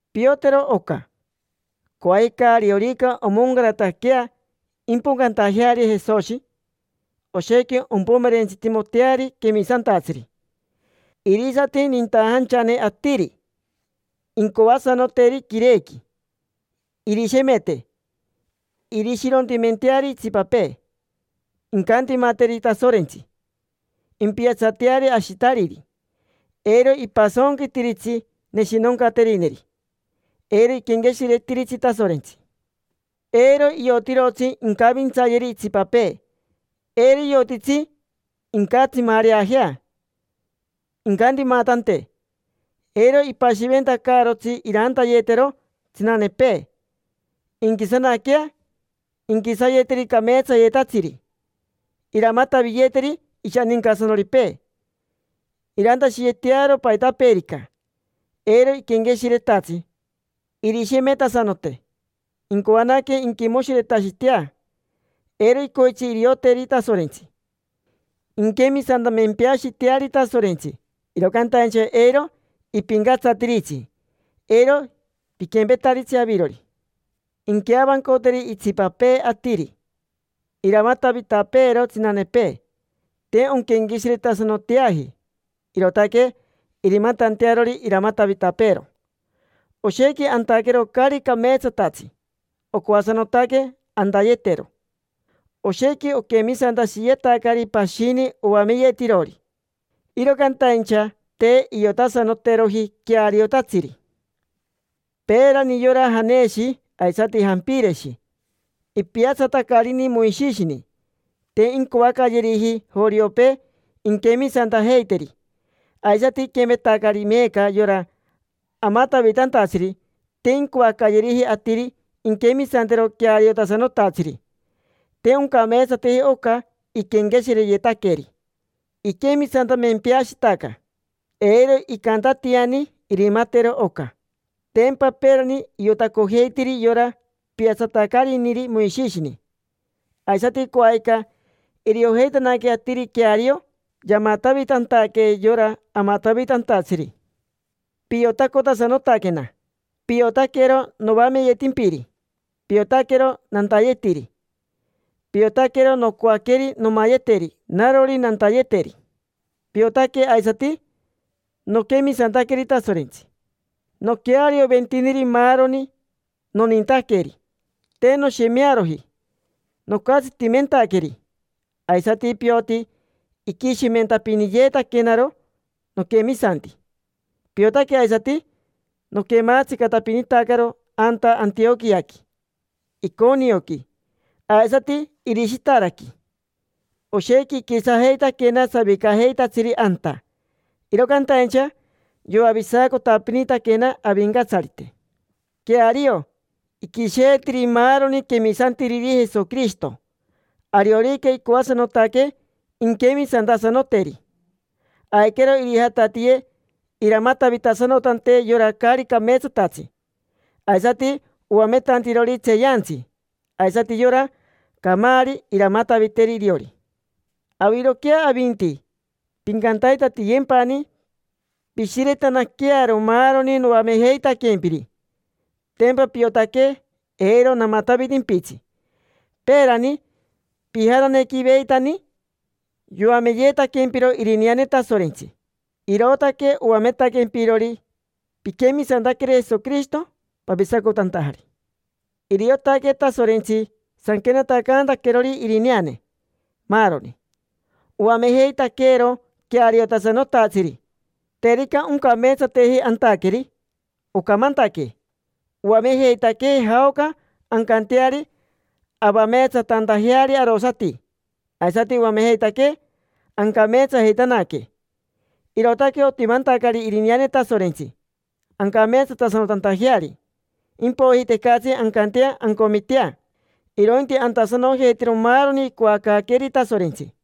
Piotero oca: coajica, ariorica omoncarataquea impocantajeari Jesoshi, oshequi ompomerentsitimoteari quemisantatsiri. Irisati nintajanchane atiri, incoasanoteri quirequi, irishemete, irishirontimenteari itsipapee, incantimateri Tasorentsi, impiatsateari ashitariri, eiro ipasonquitiritsi neshinoncaterineri, eiro iquenqueshiretiritsi Tasorentsi. Eiro iotirotsi incavintsayeri itsipapee, eiro iotitsi incatsimareajea, incantimatante, eiro ipashiventacaarotsi irantayetero tsinanepee, inquisanaquea, inquisayeteri cameetsayetatsiri, iramataviyeteri ishanincasanoripee, irantashiyetearo paitapeerica, eiro iquenqueshiretatsi, irishemetasanote, incoanaque inquimoshiretashitea, eiro icoitsi irioteri Tasorentsi. Inquemisantamempeashiteari Tasorentsi, iro cantaincha eiro ipincatsatiritsi. Eiro piquempetaritsi avirori. Inqueavancoteri itsipapee atiri, iramatavitapeero tsinanepee. Te onquenqueshiretasanoteaji, irootaque irimatantearori iramatavitapeero. Oshequi antaquero caari cameetsatatsi, ocoasanotaque antayetero. Oshequi oquemisantashiyetacari pashini oamenirotirori, iro cantaincha te iotasanoteroji queariotatsiri. Peerani yora Janeshi aisati Jampireshi ipiatsatacarini Moishishini, te incoacayeriji joriopee inquemisantajeiteri. Aisati iquempetacari meeca yora amatavitantatsiri: te incoacayeriji atiri inquemisantero queariotasanotatsiri. Te oncameetsateji oca iquenqueshireyetaqueri, iquemisantamempeashitaca. Eiro icantatiani irimatero oca. Tempa peerani iotacojeitiri yora piatsatacariniri Moishishini. Aisati coajica iriojeitanaque atiri queario yamatavitantaque yora amatavitantatsiri. Piotacotasanotaquena. Piotaquero noameyetimpiri. Piotaquero nantayetiri. Piotaquero nocoaqueri nomayeteri narori nantayeteri. Piotaque aisati noquemisantaqueri Tasorentsi, noquearioventiniri maaroni, nonintaqueri, te noshemearoji nocatsitimentaqueri. Aisati pioti iquishimentapiniyeetaquenaro noquemisanti. Piotaque aisati noquematsicatapinitacaro anta Antioquiaqui, Iconioqui, aisati Irishitaraqui. Oshequi iquisajeitaquena savicajeitatsiri anta. Iro cantaincha yoavisacotapinitaquena Avincatsarite. Queario, iquisheetiri maaroni quemisantiriri Jesoquirishito, ariorica icoasanotaque inquemisantasanoteri. Aiquero irijatatiye iramatavitasanotante yora caari cameetsatatsi, aisati oametantirori tseeyantsi. Aisati yora camaari iramataviteri iriori. Aviroquea avinti, pincantaitatiyempani pishiretanaquearo maaroni noamejeitaquempiri. Tempa piotaque eiro namatavitimpitsi. Peerani, pijananequiveitani, yoameyeetaquempiro irineane Tasorentsi. Irootaque oametaquempirori piquemisantaqueri Jesoquirishito, pavisacotantajari. Iriotaque Tasorentsi sanquenatacantaquerori irineane, maaroni. Oamejeitaqueero queariotasanotatsiri, terica oncameetsateji antaqueri, ocamantaquee. Oamejeitaquee jaoca ancanteari avameetsatantajeari arosati, aisati oamejeitaquee ancameetsajeitanaque. Irootaque otimantacari irineane Tasorentsi, ancameetsatasanotantajeari. Impoiji tecatsi ancantea ancomitea, irointi antasanojeitero maaroni icoacaaqueeri Tasorentsi.